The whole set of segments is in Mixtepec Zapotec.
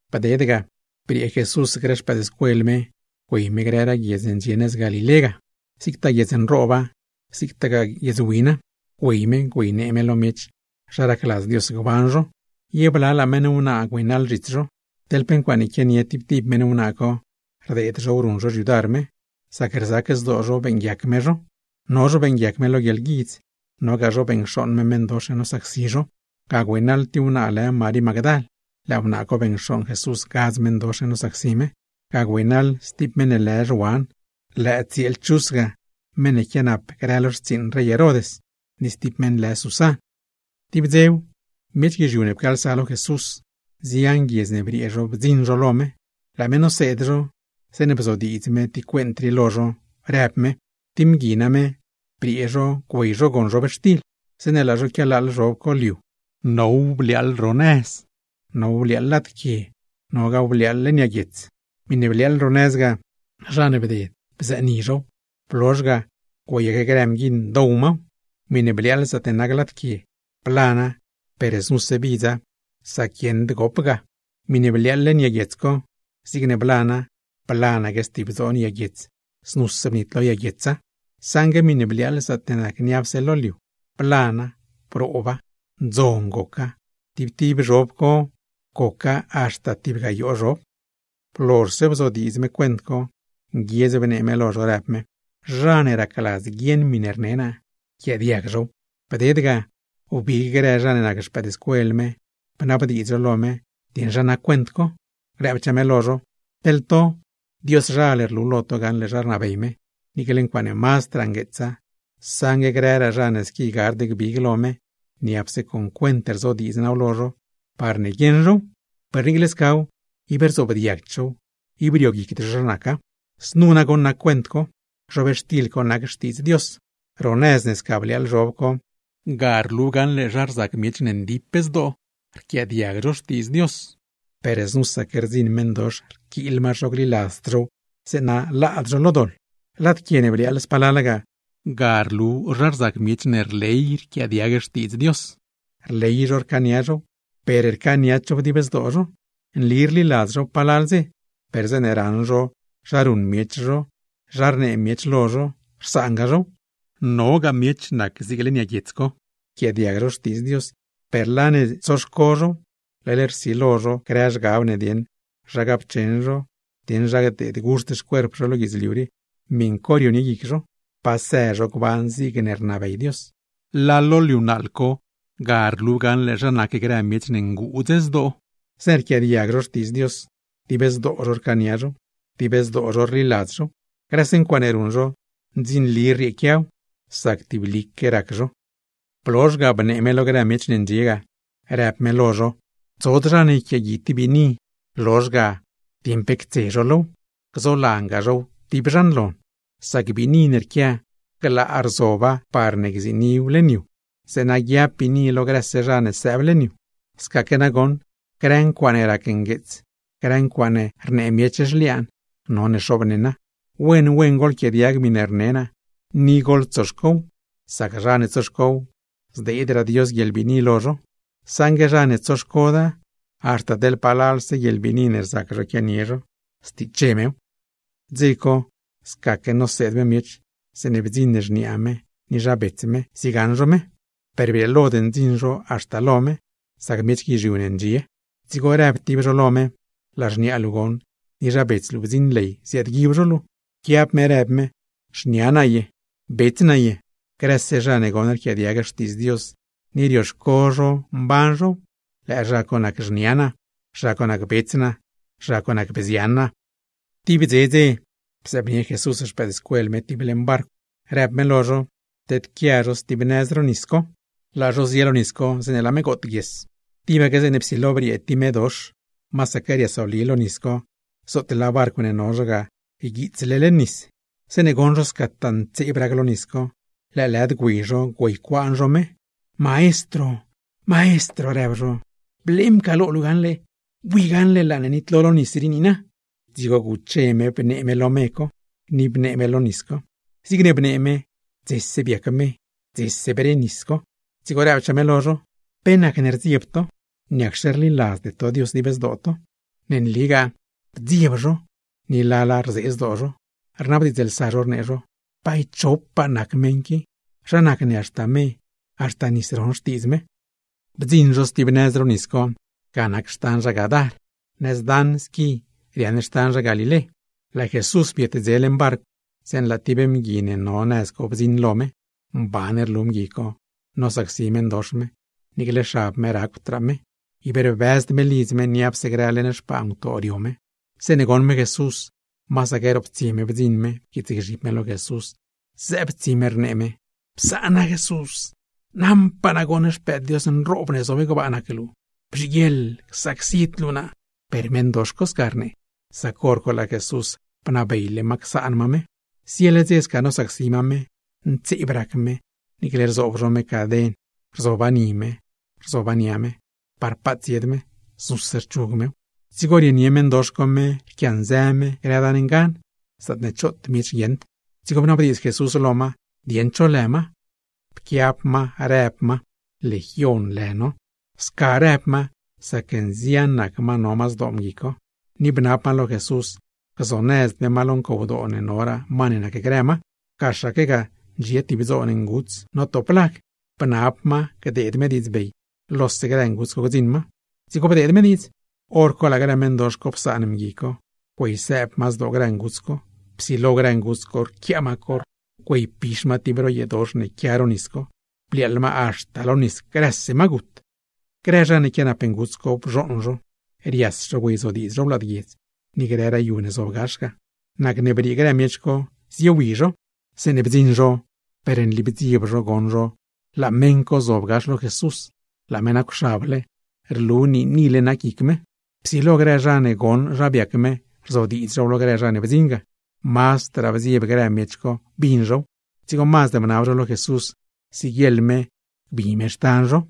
Bded ga, briee Jesús grë xpëëdscuel me güey me grëraa guiedz ne ndxie nëz Galilé ga, zigtaa guiedz nrooba, zigtaa guiedz wina, güey me güeynee me lo miech zha racladz Dios gban zho. Ye blalaa meṉ wnaa güeynaḻ zhits zho, teḻ pe ncuaaṉe quianie grë meṉ wnaa co, rdeed zhow ruṉ zho xyudar me; sac rzac zdoo zho beeṉguiac me zho. No zho beeṉguiac me lo guieḻguidz, nogaa zho beṉcxooṉ me meṉdox ne nosacsi zho. Ga güeynaḻ tib wnaa lë Marí Magdal (lëë wnaa co beṉcxooṉ Jesús gadz meṉdox ne nosacsi me), ga güeynaḻ stib meṉ lë Zhuan (lëë tsieel Chuz ga, meṉ ne quianap grë lo xtsiiṉ rey Herod) ni stib meṉ lë Susan. Tib dzew, miech guizhiu ne pcaalsa lo Jesús; nzian guiedz ne briee zho bdziṉ zho lo me. Laa me noseed zho, zeeṉe bzodiidz me tib cuent rii lo zho, rëb me: ―Tib mgui name, briee zho güey zho gon zhobxtil. Zeeṉe laa zho quialaaḻ zhob co liu, now bliaaḻ gax ro nëz, now bliaaḻ lad quie, nogaaw bliaaḻ leṉ yag guiets. Miṉe bliaaḻ ro nëz ga, zha ne bded bzëni zhow, blozh ga güeyaque grë mguiṉ dow maw. Miṉe bliaaḻ zaatne nac lad quie, blana per znuse bidza sac guieṉd gop ga. Miṉe bliaaḻ leṉ yag guiets co, zigne blana blanaque stib dzoon yag guiets, znuse bnitlo yag guietsa. Saṉgue miṉe bliaaḻ zaatne nac niapse lo liu, blana, brooba, ndzon goca, tib tib zhob ne biab liu ga now goc haxta tib gayoo zhob. Blozhse bzodiidz me cuent co, nguiedz bnee me lo zho rëb me: ―¡Zha ne racladz guieṉ miṉe rne naa, yquiaadiag zhow! Dzigo wbig grë zha ne nac xpëëdscuel me, bnabdiidz zho lo me dieṉ zha nac cuent co. Rëbchaa me lo zho: ―Teḻ to, Dioszhal rlu lo to gaṉle zha rnabey me, niicle ncuaaṉe mazdraa ngueetsa; saṉgue grëraa zha ne squi gard gbig lo me, niapse con cuent rzodiidz naaw lo zho, parne guieṉ zhow; per niicle scaw, ib rzoobdiagd zhow, ib rioguicd zho zha naca. ’Znu goṉ nac cuent co: Zhobxtil co nac Xtiidz Dios. Ro nëz ne sca bliaaḻ zhob co, ga rlu gaṉle zha rzac zha ne rquiaadiag Xtiidz Dios, per znusaque rdziṉ meṉdox rquiil ma zho gliladzd zhow, zeeṉa laad zho lo doḻ. Lad quie ne bliaaḻ spalala ga, ga rlu zha rzac zha ne rley rquiaadiag Xtiidz Dios, rley zho rcaania zhow, per rcaaniad zhow dib zdoo zho. Nli rliladz zhow palal dze, per zeeṉe raṉ zho zha ruṉ miech zho, zha rnee miech lo zho, rsaanga zhow. Nogaa zho nac zig leṉ yag guiets co. Rquiaadiag zho Xtiidz Dios, per laa ne tsoniew guic zho, leḻ rsilo zho grë zhgab ne dieṉ zha gapcheṉ cho, dieṉ zha gdeedguxt xcuerp zho lo guidzliu rii, miṉ co rionie guic zho; pa së zho gban zigne rnabey Dios. Laa lo liu naaḻ co, ga rlu gaṉle zha rzac zha ne nguudz zdoo. Zeeṉe rquiaadiag zho Xtiidz Dios, dib zdoo zho rcaania zhow, dib zdoo zho rliladz zhow. Grëse ncuaaṉe ruṉ zho, ndzinli rrieequiaw; sac tiblique rac zho. Blozh ga, bnee me lo grë miech ne ndxie ga, rëb me lo zho: ―Tsod zha ne yquiaagui tib biini, lozh ga ctoos zho pe cos low, gzolangaa zhow tib zhan lon. Sac biini ne rquia, glaa rzoba par gziiniw leṉ yu, zeeṉa guiab biini lo grëse zha ne sëëb leṉ yu. Scaque nagoṉ, grë ncuaaṉe rac ngueets, grë ncuaaṉe rnee miech zhliaan, none xoobneṉa. ’Wen wen goḻquiaadiag miṉe rne naa, ni goḻtsoxcow. Sac zha ne tsoxcow, zdeedraa Dios guieḻbiini lo zho; saṉgue zha ne tsoxcoda, haxta teḻ palalse guieḻbiini ne rzac zho quianie zho, stiche mew. Dze co, scaque noseed me miech, zeeṉe bdziṉ xniaa me ni zha bets me ziegaṉ zho me. Per brieelod ndziṉ zho haxta lo me, sac miech guizhiu ne ndxie lo me ga. Dzigo rëb tib zho lo me: ―Laa xniaa luu goṉ, ni zha bets luu bdziṉ ley ziaadguib zho luu. Pquiab me rëb me: ―¿Xnia naa ye, bets naa ye? Grëse zha ne goṉ rquiaadiag Xtiidz Dios ni rioxco zho mban zhow, lëë zha co nac xniaa naa, zha co nac bets naa, zha co nac bzian naa. Tib bdze dze, bzëëbnie Jesús xpëëdscuel me tib leṉ barcw, rëb me lo zho, tedquia zho stib nëz ro nis co. Laa zho zie lo nis co zeeṉe laa me gootguies. Tibaque zeeṉe psilo briee tib medox, masaque riasoli lo nis co, zootle laa barcw ne no zho ga yguiitsle leṉ nis. Zeeṉe goṉ zho scataa ntseeb rac lo nis co, lëëlëd güey zho güeycuaan zho me. ―¡Maestro! ―rëb zho―. ¡Blee mcaaḻlo luu gaṉle, laa ne nonitlo lo nis rii niina! Dzigo guche me bnee me lo me co, ni bnee me lo nis co. Zigne bnee me, dzese biac me, dzese bre nis co. Dzigo rëbchaa me lo zho: ―¿Pe nacne rdzieb to? ¿Niacxe rliladzde to Dios dib zdoo to? Ne nligaa rdzieb zho, ni lala rzee zdoo zho, rnabdiidzlsa zho rnee zho: ―¿Bay cho nac me? ¿Zha nacne haxta me, haxta nis ron xtiidz me? Bdziṉ zho stib nëz ro nis co, ga nac xtan zha Gadar. Zo zho ga, nëz daṉ squi riaaṉ xtan zha Galilé. Laa Jesús bietdze leṉ barcw, zeeṉe laa tib mgui ne no nëz co bdziṉ lo me. Mban rlu mgui co nosacsi meṉdox me, niicle xab me nacwdraa me; ib rbëzd me lidz me, niapse grë leṉ xpaa ngutoo rio me. Zeeṉe goṉ me Jesús, masaque roptsie me bdziṉ me pquiitsgzhib me lo Jesús, zëëb tsi me rnee me: ―¡Psaan naa Jesús! Naṉpaa naa goṉ Xpëëd Dios nroob ne zob gbaa nac luu. ¡Bzhiguieḻ csacsid luu naa! Per meṉdox co sca rnee, sac hor co laa Jesús bnabeyle ma csaan ma me. Ziele dze sca nosacsi ma me, ntseeb rac me, niicle rzoob zho caden ni me, rzoob zho caden nia me, parne paat tsied me, znuse rchug mew; dzigo rienie meṉdox co me rquianzë me grë dan ngan, zaatne choot miech guieṉd. Dzigo bnabdiidz Jesús lo ma dieṉ cho lë ma. Pquiab ma rëb ma: ―Legion lë no. Sca rëb ma sac nzian nac ma no ma zdoo mgui co. Ni bnab ma lo Jesús gzonëzd me ma lo ncowdoo ne noraa ma ne nacgrë ma. Gaxaque ga ndxie tib dzoon nguts notop lag, bnab ma gdeed me diidzbey lose grë nguts co gdziṉ ma. Dzigo bdeed me diidz. Horco laa grë meṉdox co psaan mgui co, güeysëëb ma zdoo grë nguts co. Psilo grë nguts co rquiaa ma corr, güeypix ma tib ro yeedox ne quia ro nis co, bliaaḻ ma haxta lo nis; grëse ma gut. Grë zha ne quianap nguts co, bzhooṉ zho, rias zho güeyzodiidz zhow lad guiedz, ni grëraa yu ne zob gax ga. Nacne briee grë miech co ziewi zho. Zeeṉe bdziṉ zho, per nli bdzieb zho goṉ zha laa meṉ co zob gax lo Jesús, laa me nacwxable, rlu niinile nac guic me. Psilo grë zha ne goṉ zha biac me rzodiidz zhow lo grë zha ne bdziṉ ga. Mazdraa bdzieb grë miech co bin zhow, dzigo mazd bnab zho lo Jesús siguieḻ me gbi me xtan zho.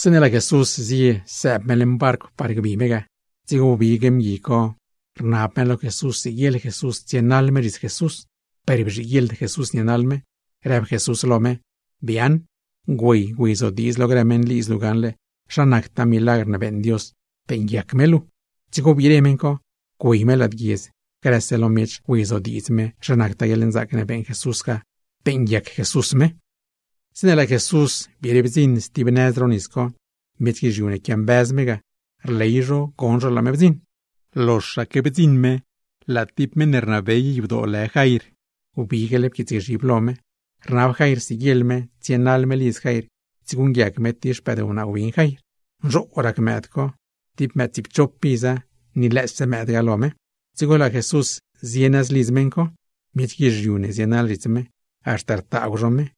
Zeeṉe laa Jesús zie sëëb me leṉ barcw par gbi me ga, dzigo wbig mgui co rnab me lo Jesús siguieḻ Jesús tsienaḻ me zhits Jesús; per bzhiguieḻd Jesús nienaḻ me, rëb Jesús lo me: ―¡Biaaṉ! Güey, güeyzodiidz lo grë meṉlidz luu gaṉle zha nactaa milagr ne beeṉ Dios beeṉguiac me luu. Dzigo wbire meṉ co. Güey me lad guiedz, grëse lo miech güeyzodiidz me zha nactaa guieḻnzaac ne beeṉ Jesús ga, beeṉguiac Jesús me. Zeeṉe laa Jesús biire bdziṉ stib nëz ro nis co, miech guizhiu ne quiambëz me ga, rley zho goṉ zho laa me bdziṉ. Loxaque bdziṉ me, laa tib meṉ ne rnabey yadoo lë Jair wbigle pquiitsgzhib lo me. Rnab Jair siguieḻ me tsienaḻ me lidz Jair tsieguṉguiac me tib xpëdwnaa win Jair. Nzhoo rac mëëd co, tib mëëd tsiipchop iza, ni lëëse mëëd ga lo me. Dzigo laa Jesús zie nëz lidz meṉ co. Miech guizhiu ne zienaḻ zhits me, haxta rtaagw zho me.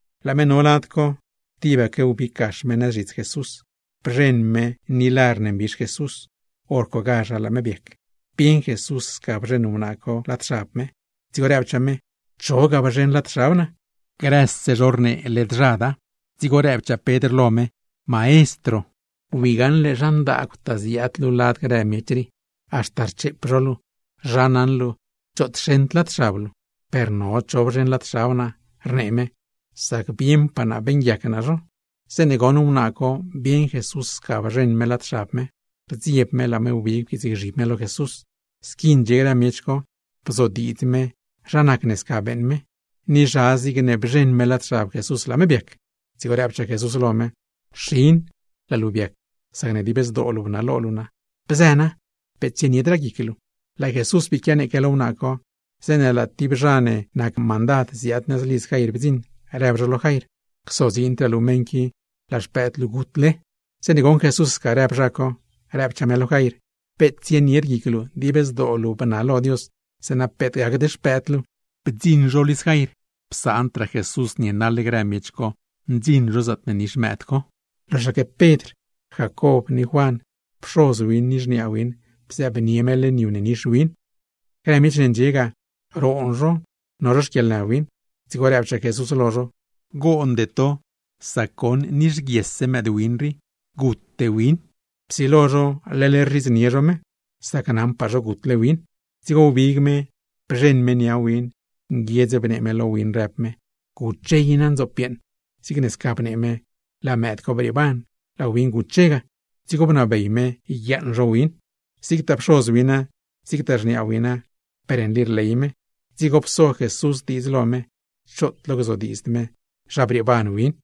Laa me no lad co, tibaque wbig gax me nëz zhits Jesús, bzheṉ me ni lar ne mbix Jesús; hor cogazha laa me biac. Bieṉ Jesús sca bzheṉ wnaa co lad xab me, dzigo rëbchaa me: ―¿Cho ga bzheṉ lad xab naa? Grëse zho rnee led zhada. Dzigo rëbchaa Pedr lo me: ―Maestro, wi gaṉle zha ndaagwtaa ziaad luu lad grë miech rii, haxta rcheep zho luu, ¿zha naṉ luu choot xeṉd lad xab luu? ―Per no cho bzheṉ lad xab naa ―rnee me―, sac bieṉpaa naa beeṉguiac naa zho. Zeeṉe goṉ wnaa co bieṉ Jesús sca bzheṉ me lad xab me, rdzieb me laa me wbig pquiitsgzhib me lo Jesús. Squi ndxie grë miech co, bzodiidz me zha nacne sca beeṉ me, ni zha zigne bzheṉ me lad xab Jesús laa me biac. Dzigo rëbchaa Jesús lo me: ―Xin, laa luu biac sacne dib zdoo luu bnalo luu naa. Bzë na, peet tsieniedraa guic luu. Laa Jesús bii quianeeque lo wnaa co, zeeṉe laa tib zha ne nac mandad ziaad nëz lidz Jair bdziṉ, rëb zho lo Jair: ―Csodziindraa luu lo meṉ qui, laa xpëëd luu gutle. Zeeṉe goṉ Jesús sca rëb zha co, rëbchaa me lo Jair: ―Peet tsienied guic luu. Dib zdoo luu bnalo Dios, zeeṉa peet gacd xpëëd luu. Bdziṉ zho lidz Jair, psaandraa Jesús naḻ grë miech co zhits me ndziṉ zho zaatne nix mëëd co. Loxaque Pedr, Jacob, ni Juan, pxoz win ni xniaa win bzëëbnie me leṉ yu ne nix win. Grë miech ne ndxie ga, roon zho no zho xquieḻnë win; dzigo rëbchaa Jesús lo zho: ―Goonde to; sac goṉ nixguiesse mëëdwin rii, gute win. Psilo zho leḻ rzhidznie zho me, sac naṉpaa zho gutle win. Dzigo wbig me, bzheṉ me nia win, nguiedz bnee me lo win, rëb me: ―¡Guche i na, ndzoop yeeṉ! Zigne sca bnee me, laa mëëd co brieeban, laa win guche ga; dzigo bnabey me bguiaaṉ zho win. Zigtaa pxoz wina, zigtaa xniaa wina, per nli rley me. Dzigo pso Jesús diidz lo me, choot lo gzodiidzd me zha brieeban win.